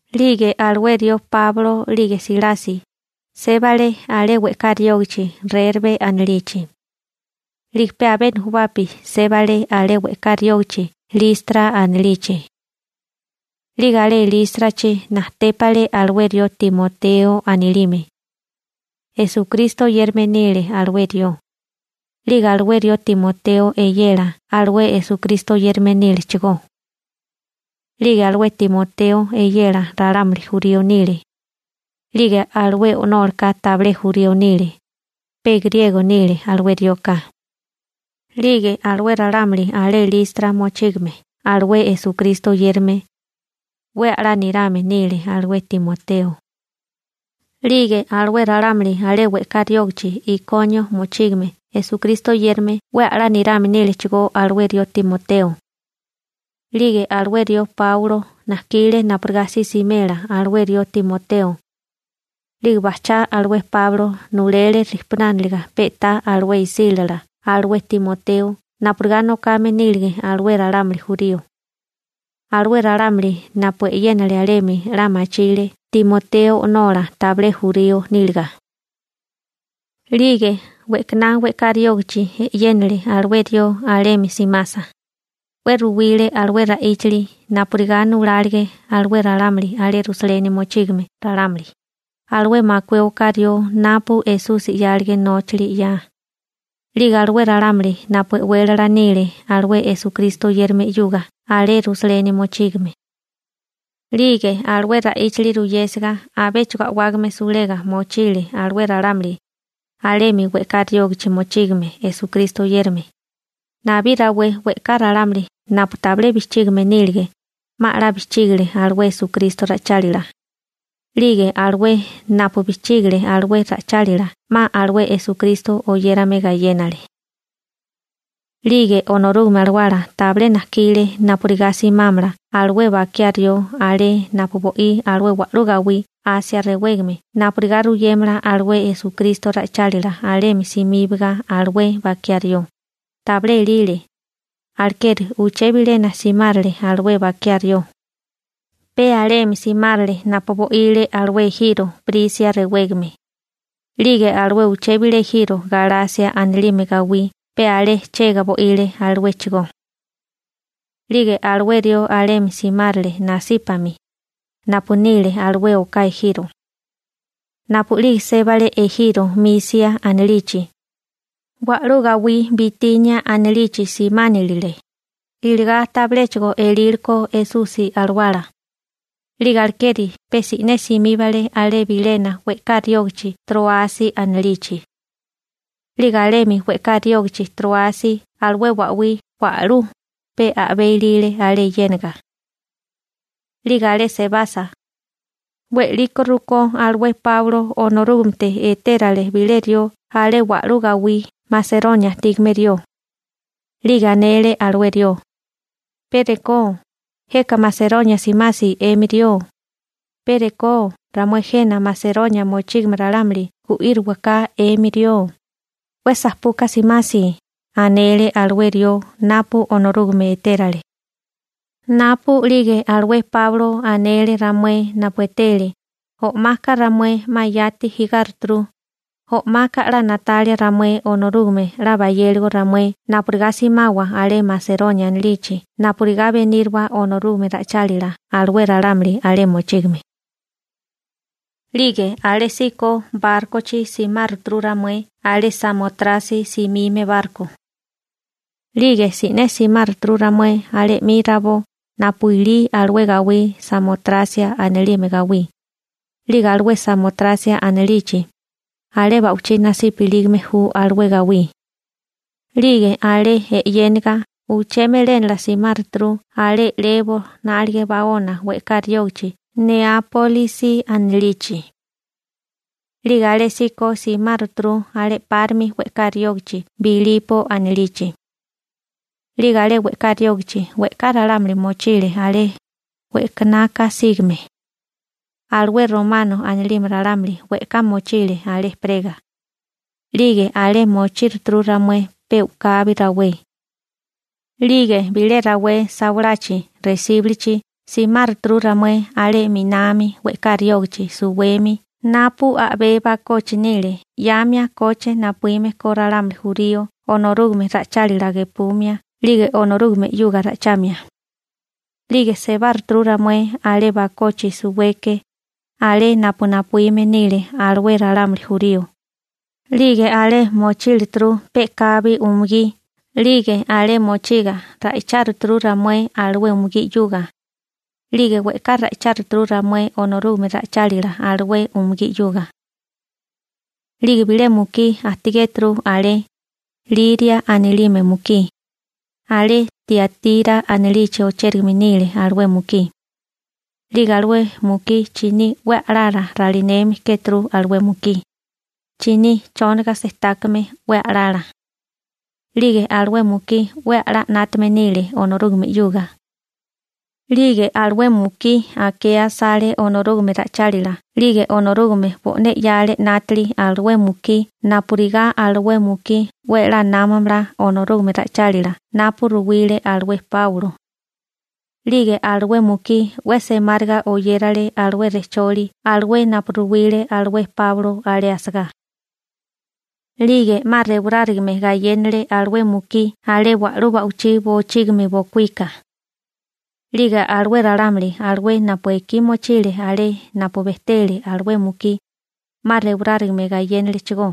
'Lige alué rió Páulo 'lige Silasi sébale alé we'ká riógichi Rerbe anilichi. 'Lige pe abé nujubapi sébale alé we'ká riógichi Listra anilichi. 'Lige alé Lístrachi najtépale alué rió Timoteo anilime. Esukristo oyérame nile alué rió. 'Lige alué rió Timoteo eyela alué Esukristo oyérame nílechigó. 'Lige alué Timoteo eyela ralámuli jurío nile. 'Lige alué o'nólaka tabilé jurío nile, pe griego nile alué rioka. 'Lige alué ralámuli alé Listra mochígame alué Esukristo oyérame, 'we a'lá nirame nile alué Timoteo. 'Lige alué ralámuli alé we'ká riógichi Ikonio mochígame Esukristo oyérame 'we a'lá nirame nílechigó alué rió Timoteo. 'Lige alué rió Páulo najkile napurigá si simela alué rió Timoteo. 'Lige bajchá alué Páulo nulele rijpunániliga pe'tá alué isílala alué Timoteo napurigá nokame nílige alué ralámuli jurío. Alué ralámuli napu e'yénale alemi 'la machile Timoteo o'nola tabilé jurío níliga. 'Lige we'kaná we'ká riógichi e'yénale alué rió alemi simasa, 'we ruwile alué ra'íchili napurigá nulálige alué ralámuli alé Rusaleni mochígame ralámuli, alué makué oká rió napu Esusi 'yálige nóchili 'ya, 'lige alué ralámuli napu e'wélala nile alué Esukristo oyérame 'yuga alé Rusaleni mochígame. 'Lige alué ra'íchili ruyésiga abéchigo a'wágame sulega mochile alué ralámuli alemi we'ká riógichi mochígame Esukristo oyérame. Nabí rawé we'ká ralámuli napu tabilé bijchígime nílige, 'ma 'la bijchígile alué Esukristo ra'ichálila. 'Lige alué napu bijchígile alué ra'ichálila 'ma alué Esukristo oyérame gayénale. 'Lige Onorúgame Alawala tabilé najkile napurigá simámala alué bakiá rió alé napu bo'í alué wa'lú gawí Asia rewégame napurigá ruyémela alué Esukristo ra'ichálila alemi simíbaga alué bakiá rió, tabilé elile. Alekeri uché bilena simárele alué bakiá rió. Pe alemi simárele napu bo'ile alué ejiro Prisia rewégame. 'Lige alué uché bilé ejiro Galasia anilime gawí pe alé chega bo'ile aluéchigó. 'Lige alué rió alemi simárele nasípami, napu nile alué oká ejiro. Napu'lige sébale ejiro Misia anilichi, wa'lú gawí Bitinia anilichi simáninile, iligá tabiléchigo elíliko Esusi Alawala. 'Lige alekeri pe si'né simíbale alé bilena we'ká riógichi Tróasi anilichi. 'Lige alemi we'ká riógichi Tróasi alué ba'wí wa'lú pe a'bé ilile alé yéniga. 'Lige alé sebasa, we'liko rukó alué Páulo Onorúgamete etérale bilé rió alé wa'lú gawí Maseronia ajtígame rió. 'Lige anele alué rió: ―Pe rekó jeka Maseronia simasi 'emi rió, pe rekó ramué jena Maseronia mochígame ralámuli gu'íriwaká 'emi rió, 'we sapuka simasi ―anele alué rió napu Onorúgame etérale. Napu'lige alué Páulo anele ramué napu etele, o'maka ramué 'ma yati jigáruturu. O'maka 'la na'talia ramué Onorúgame 'la bayéligo ramué napurigá simawa alé Maseronia anilichi napurigá beníriwa Onorúgame ra'ichálila alué ralámuli alé mochígame. 'Lige alésíko bárkochi simáruturu ramué alé Samotrasia simime barko. 'Lige si'né simáruturu ramué alé 'mi rabó napu ilí alué gawí Samotrasia anilime gawí. 'Lige alué Samotrasia anilichi, alé ba'wichí nasipa ilígame ju alué gawí. 'Lige alé e'yéniga uché melénala simáruturu alé 'lebo 'nálige baona we'ká riógichi Neápolisi anilichi. 'Lige alésíko simáruturu alé 'párimi we'ká riógichi Bilipo anilichi. 'Lige alé we'ká riógichi we'ká ralámuli mochile alé we'kanaka sígame. Alué Romano anilime ralámuli we'ká mochile alé ejperega. 'Lige alé mochíruturu ramué pe u'kabi rawé. 'Lige bilé rawé sawalachi resíbulichi simáruturu ramué alé 'minami we'ká riógichi suwemi napu a'bé bakochi nile 'yamia koche napuíme ko ralámuli jurío Onorúgame ra'ichálila gepumia 'lige Onorúgame 'yuga ra'ichamia. 'Lige sebáruturu ramué alé bakochi suweke, alé napu napuíme nile alué ralámuli jurío. 'Lige alé mochílituru pe'kabi umugí 'lige alé mochiga ra'icháruturu ramué alué umugí 'yuga. 'Lige we'ká ra'icháruturu ramué Onorúgame ra'ichálila alué umugí 'yuga. 'Lige bilé mukí ajtigéturu alé, Liria anilime mukí, alé Tiatira anilichi ochérigame nile alué mukí. 'Lige alué mukí chiní 'we a'lala ralineme kéturu alué mukí, chiní chóniga-sejtákame 'we a'lala. 'Lige alué mukí 'we a'lá 'nátame nile Onorúgame 'yuga. 'Lige alué mukí akea asale Onorúgame ra'ichálila 'lige Onorúgame bo'né 'yale 'nátili alué mukí napurigá alué mukí 'we a'lá námamala Onorúgame ra'ichálila napu ruwile alué Páulo. 'Lige alué mukí 'we semáriga oyérale alué rejcholi alué napu ruwile alué Páulo alé asagá. 'Lige 'ma rewarárigame gayénale alué mukí alé wa'lú ba'wichí bochígimi bokuíka. 'Lige alué ralámuli alué napu ekí mochile alé napu bejtele alué mukí, 'ma rewarárigame gayénalechigó,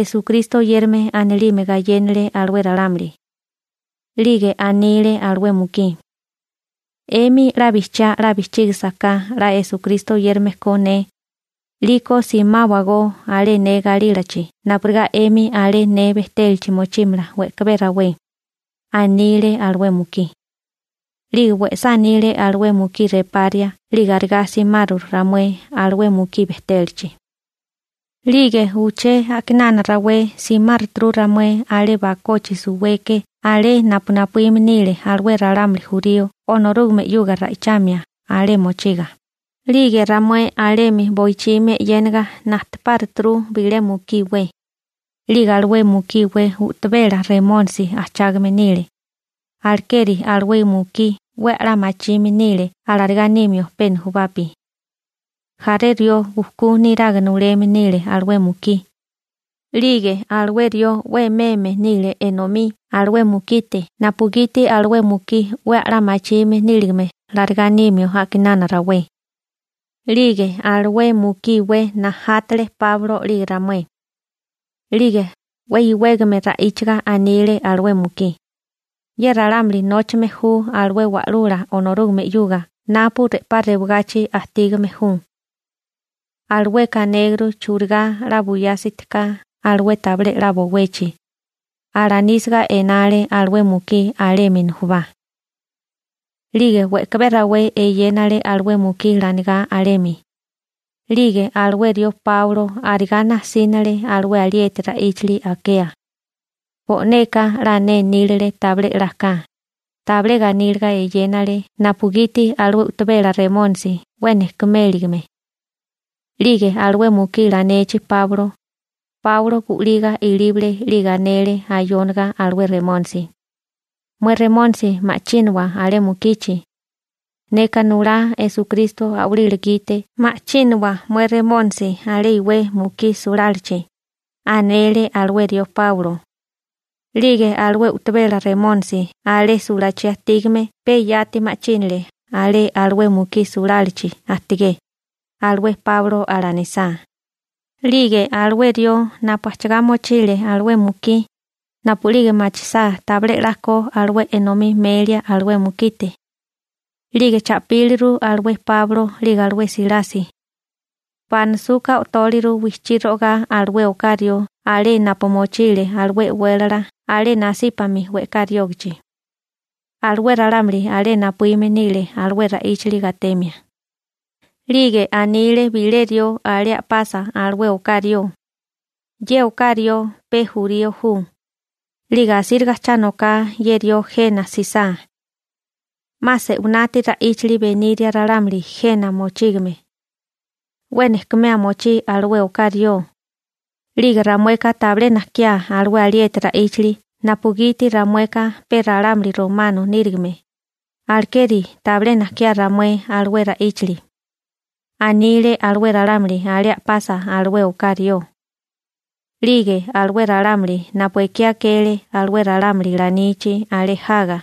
Esukristo oyérame anilime gayénale alué ralámuli. 'Lige anile alué mukí: ―'Emi 'la bijchiá 'la bijchígisaká 'la Esukristo oyérame ko ne, 'liko simáwagó alé ne galílachi napurigá 'emi alé ne bejtélachi mochímala we'kabé rawé ―anile alué mukí. 'Lige we'sá anile alué mukí reparia 'lige arigá simaru ramué alué mukí bejtélachi. 'Lige uché a'kinana rawé simáruturu ramué alé bakochi suweke alé napu napuíme nile alué ralámuli jurío Onorúgame 'yuga ra'ichamia alé mochiga, 'lige ramué alemi boichimi e'yénaga najtepáruturu bilé mukí iwé. 'Lige alué mukí iwé u'tabela remónisi ajchágame nile, alekeri alué mukí 'we a'lá machime nile alarigá nimio pe nujubapi. Jaré rió bujkú niraga nuleme nile alué mukí. 'Lige alué rió 'we meme nile enomí alué mukite napugiti alué mukí 'we a'lá machime níligame alarigá nímio a'kinana rawé. 'Lige alué mukí iwé najátele Páulo 'lige ramué. 'Lige 'we iwégame ra'íchaga anile alué mukí: ―Ye ralámuli nóchame ju alué Wa'lula Onorúgame 'yuga napu re'pá rewagachi ajtígame ju. Alueka anéguru churigá 'la buyásitika alué tabilé 'la bowechi ―alanísiga enale alué mukí alemi nujubá. 'Lige we'kabé rawé eyénale alué mukí lanigá alemi. 'Lige alué rió Páulo arigá nasínale alué alieti ra'íchili akea. Bo'neka 'la nénílile tabilé 'la ka, tabilé ganíliga eyénale napugiti alué u'tabela remónisi 'we nejkuméligime. 'Lige alué mukí lanechi Páulo, Páuloka gu'liga ilíbale 'lige anele ayóniga alué Remónisi: ―Mué remónisi ma'chínawa alé mukichi. Neka nulá Esukristo a'walila gite ma'chínawa mué remónisi alé iwé mukí sulálachi ―anele alué rió Páulo. 'Lige alué u'tabela remónisi alé sulachí ajtígame pe yati ma'chínale alé alué mukí sulálachi ajtigé, alué Páulo alanisá. 'Lige alué rió napu ajchigá mochile alué mukí, napu'lige machisá tabilé 'la ko alué enomí melia alué mukite, 'lige cha'píliru alué Páulo 'lige alué Silasi. Banasuka o'tóliru wijchí ro'ogá alué oká rió alé napu mochile alué e'wélala alé nasípami we'ká riógichi. Alué ralámuli alé napuíme nile alué ra'íchili gatemia. 'Lige anile bilé rió alé a'pasa alué oká rió: ―Ye oká rió pe jurío ju, 'lige asíriga cha noká ye rió jena jsisá. 'Ma se'winati ra'íchili beniria ralámuli jena mochígame. 'We nejkumea mochí alué oká rió. 'Lige ramueka tabilé najkiá alué alieti ra'íchali napugiti ramueka pe ralámuli romano nírigime, alekeri tabilé najkiá ramué alué ra'íchili ―anile alué ralámuli alé a'pasa alué oká rió. 'Lige alué ralámuli napu ekí akele alué ralámuli lanichi alé jaga,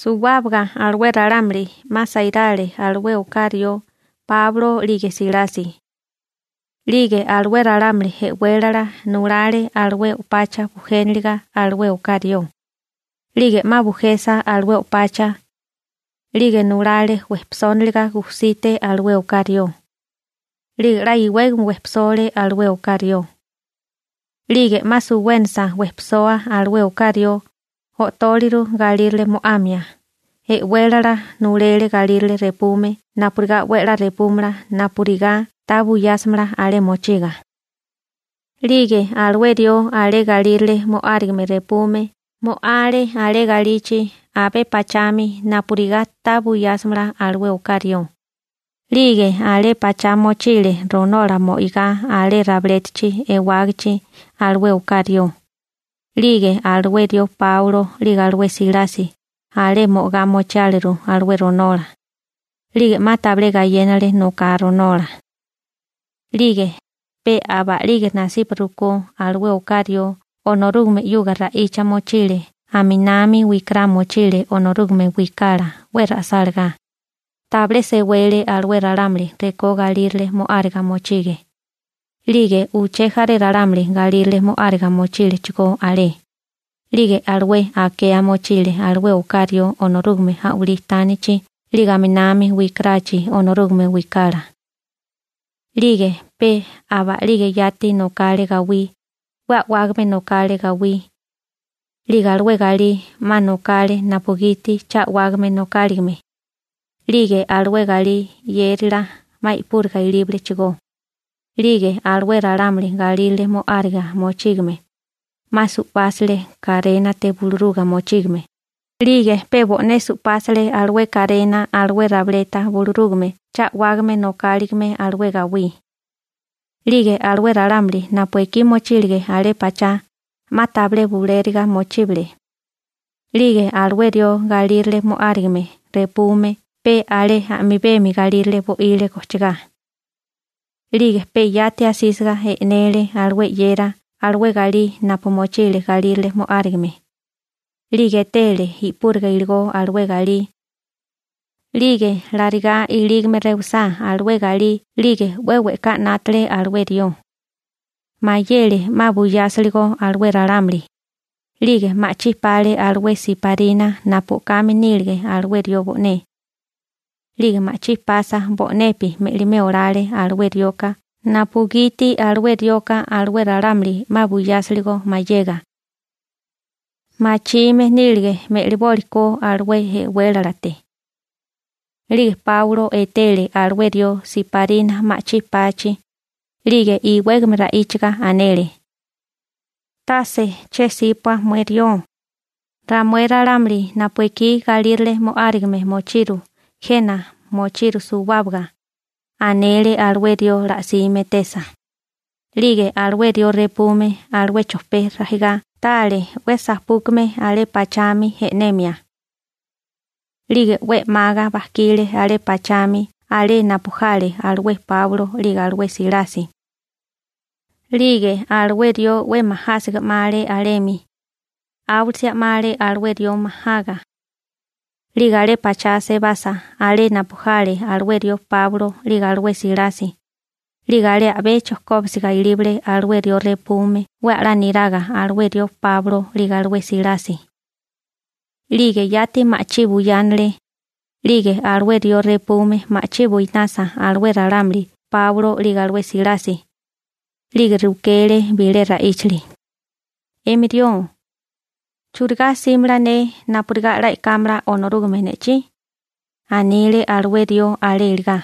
suwábaga alué ralámuli 'ma sairale alué oká rió Páulo 'lige Silasi. 'Lige alué ralámuli e'wélala nulale alué o'pacha bujénalaga alué oká rió. 'Lige 'ma bujesa alué o'pacha, 'lige nulale wejpisóniliga gusite alué oká rió. 'Lige 'la iwégame wejpisole alué oká rió. 'Lige 'ma suwénasa wejpisoa alué oká rió, o'tóliru galírale mo'amia. E'wélala nulele galírale repume napurigá 'we 'la repúmala napurigá ta buyásimala alé mochiga. 'Lige alué rió alé galírale mo'árigame repume mo'ale alé galichi abé pachami napurigá ta buyásimala alué oká rió. 'Lige alé pachá mochile ronola mo'igá alé rabilétachi ewágachi alué oká rió. 'Lige alué rió Páulo 'lige alué Silasi alé mo'agá mochiáleru alué ronola. 'Lige 'ma tabilé gayénale noká ronola. 'Lige pe aba a'lige nasipa rukó alué oká rió Onorúgame 'yuga ra'icha mochile aminami wikará mochile Onorúgame wikala 'we ra'sálagá, tabilé sewele alué ralámuli rekó galírale mo'áriga mochige. 'Lige uché jaré ralámuli galírale mo'áriga mochílechigó alé, 'lige alué akea mochile alué oká rió Onorúgame a'walí tánichi, 'lige aminami wikarachi Onorúgame wikala. 'Lige pe aba a'lige yati nokale gawí, 'we a'wágame nokale gawí. 'Lige alué galí 'ma nokale napugiti cha a'wágame nokáligame. 'Lige alué galí 'yérila 'ma i'púriga ilíbalechigó. 'Lige alué ralámuli galírale mo'áriga mochígame, 'ma supásile karénate buluruga mochígame. 'Lige pe bo'né su'pásale alué karena alué rabileta bulurúgame cha a'wágame nokáligame alué gawí. 'Lige alué ralámuli napu ekí mochílige alé pachá, 'ma tabilé bulériga mochíbale. 'Lige alué rió galírale mo'árigame repume pe alé a'mibemi galírale bo'ile gojchigá. 'Lige pe yati asísiga e'nele alué 'yera alué galí napu mochile galírale mo'árigame. 'Lige etele i'púriga iligó alué galí. 'Lige larigá ilígame rewisá alué galí 'lige 'we we'ká 'nátale alué rió. Mayele 'ma buyásiligo alué ralámuli. 'Lige ma'chí pale alué siparina napu o'kame nílige alué rió bo'né. 'Lige ma'chí pasa bo'nepi me'limé olale alué rioka napugiti alué rioka alué ralámuli 'ma buyásiligo mayega. Machime nílige me'libólikó alué e'wélalate. 'Lige Páulo etele alué rió siparina ma'chí pachi. 'Lige iwégame ra'íchaga anele: ―Tase che 'sípua mué rió, ramué ralámuli napu ekí galírale mo'árigame mochiru jena mochiru suwábaga ―anele alué rió la'sime etesa. 'Lige alué rió repume alué chojpé rajigá tale 'we sapúkame alé pachami e'nemia. 'Lige 'we 'maga bajkile alé pachami alé napu jale alué Páulo 'lige alué Silasi. 'Lige alué rió 'we majásiga 'male alemi, áwilisia 'male alué rió majaga. 'Lige alé pachá sebasa alé napu jale alué rió Páulo 'lige alué Silasi, 'lige alé a'bé chojkóbisiga ilíbale alué rió repume 'we a'lá niraga alué rió Páulo 'lige alué Silasi. 'Lige yati ma'chí buyánale. 'Lige alué rió repume ma'chí buinasa alué ralámuli Páulo 'lige alué Silasi, 'lige rukele bilé ra'íchili: ―'Emi rió ¿churigá 'símala ne napurigá 'la e'kámala Onorúgame ne'chí? ―anile alué rió alé iligá.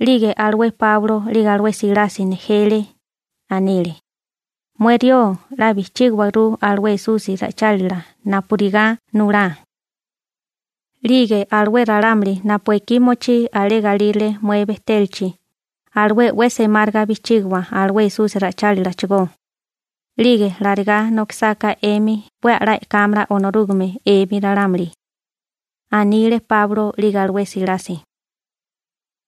'Lige alué Páulo 'lige alué Silasi nejele, anile: ―Mué rió 'la bijchígawaguru alué Esusi ra'ichálila napurigá nulá. 'Lige alué ralámuli napu ekí mochí alé galírale mué bejtélachi, alué 'we semáriga bijchígiwa alué Esusi ra'ichálilachigó. 'Lige larigá nokisáká 'emi 'we a'lá e'kámala Onorúgame 'emi ralámuli ―anile Páulo 'lige alué Silasi.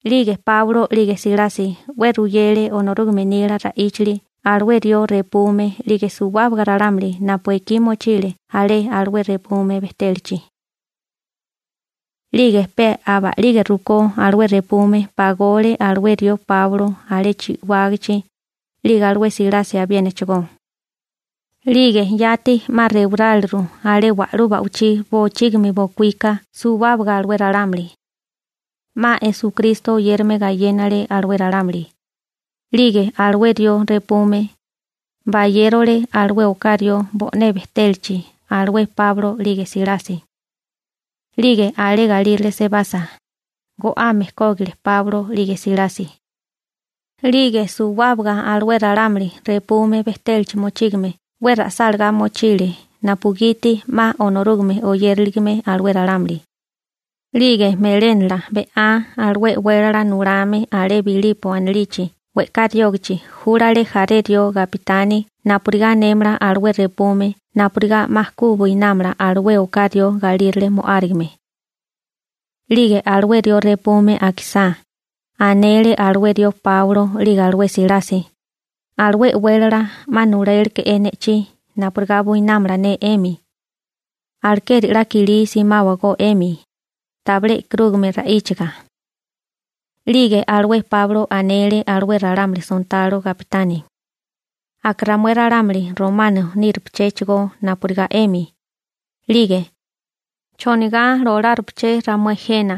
'Lige Páulo 'lige Silasi 'we ruyele Onorúgame nila ra'íchali alué rió repume 'lige suwábaga ralámuli napu ekí mochile alé alué repume bejtélachi. 'Lige pe aba'lige rukó alué repume pagole alué rió Páulo alé chi'wágichi, 'lige alué Silasi abiénachigó. 'Lige yati 'ma rewaráleru alé wa'lú ba'wichí bochígimi bokuíka suwábaga alué ralámuli, 'ma Esukristo oyérame gayénale alué ralámuli. 'Lige alué rió repume, bayérole alué oká rió bo'né bejtélachi alué Páulo 'lige Silasi. 'Lige alé galírale sebasa, go'ame kógile Páulo 'lige Silasi. 'Lige suwábaga alué ralámuli repume bejtélachi mochígame 'we ra'sálagá mochile napugiti 'ma Onorúgame oyériligame alué ralámuli. 'Lige melénala be'á alué e'wélala nulame alé Bilipo anilichi we'ká riógichi júlale jaré rió gapitani napurigá anémala alué repume napurigá 'ma ku buinámala alué oká rió galírale mo'árigame. 'Lige alué rió repume akisá, anele alué rió Páulo 'lige alué Silasi: ―Alué e'wélala 'ma nuléleke'é ne'chí napurigá buinámala ne 'emi. Alekeri 'la kilí simáwagó 'emi, tabilé e'karúgame ra'íchaga. 'Lige alué Páulo anele alué ralámuli sontalo gapitani: ―Aka ramué ralámuli romano nírupachéchigó napurigá 'emi. 'Lige ¿chonigá lolárupaché ramué jena?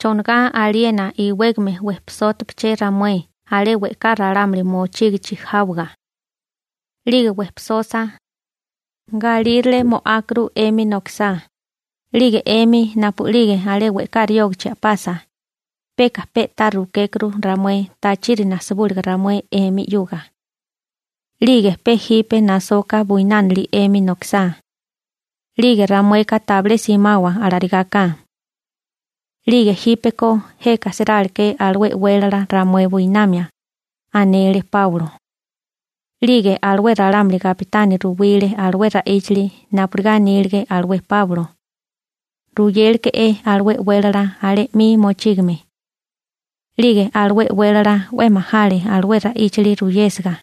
¿Chonigá aliena iwégame wejpisótupaché ramué alé we'ká ralámuli mochígichi jáwaga? 'Lige wejpisosa, galírale mo'ákuru 'emi nokisá. 'Lige 'emi napu'lige alé we'ká riógichi a'pasa, peka pe'tá rukékuru ramué tachiri nasibúliga ramué 'emi 'yuga. 'Lige pe jipe nasoka buinánili 'emi nokisá. 'Lige ramueka tabilé simawa alarigáká. 'Lige jípeko jeka siráleké alué e'wélala ramué buinamia ―anele Páulo. 'Lige alué ralámuli gapitani ruwile alué ra'íchali napurigá anílige alué Páulo, ruyéleke'é alué e'wélala alé 'mi mochígame. 'Lige alué e'wélala 'we majale alué ra'íchili ruyésiga,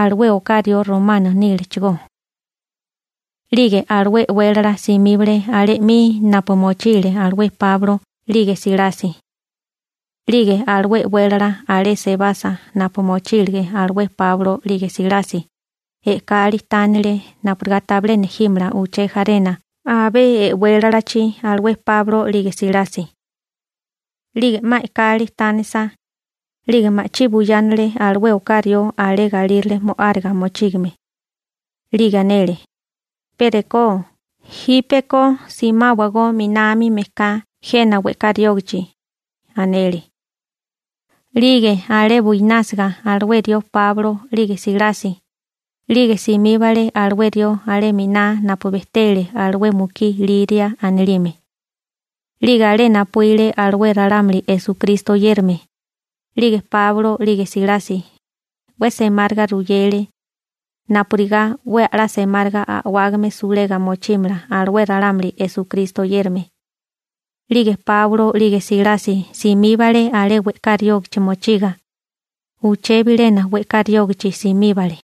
alué oká rió romano nílechigó. 'Lige alué e'wélala simíbale alé 'mi napu mochile alué Páulo 'lige Silasi. 'Lige alué e'wélala alé sebasa napu mochílige alué Páulo 'lige Silasi, e'kali tánele napurigá tabilé nejímala uché jarena abé e'wélalachi alué Páulo 'lige Silasi. 'Lige 'ma e'kali tánisa, 'lige ma'chí buyánele alué oká rió alé galírale mo'áriga mochígame. 'Lige anele: ―Pe rekó jípeko simáwagó 'minami mejká jena we'ká riógichi ―anele. 'Lige alé buinásiga alué rió Páulo 'lige Silasi, 'lige simíbale alué rió alé miná napu bejtele alué mukí Liria anilime. 'Lige alé napuíle alué ralámuli Esukristo oyérame. 'Lige Páulo 'lige Silasi, 'we semáriga ruyele napurigá 'we a'lá semáriga a'wágame sulega mochímala alué ralámuli Esukristo oyérame. 'Lige Páulo 'lige Silasi simíbale alé we'ká riógichi mochiga. Uché bilena we'ká riógichi simíbale.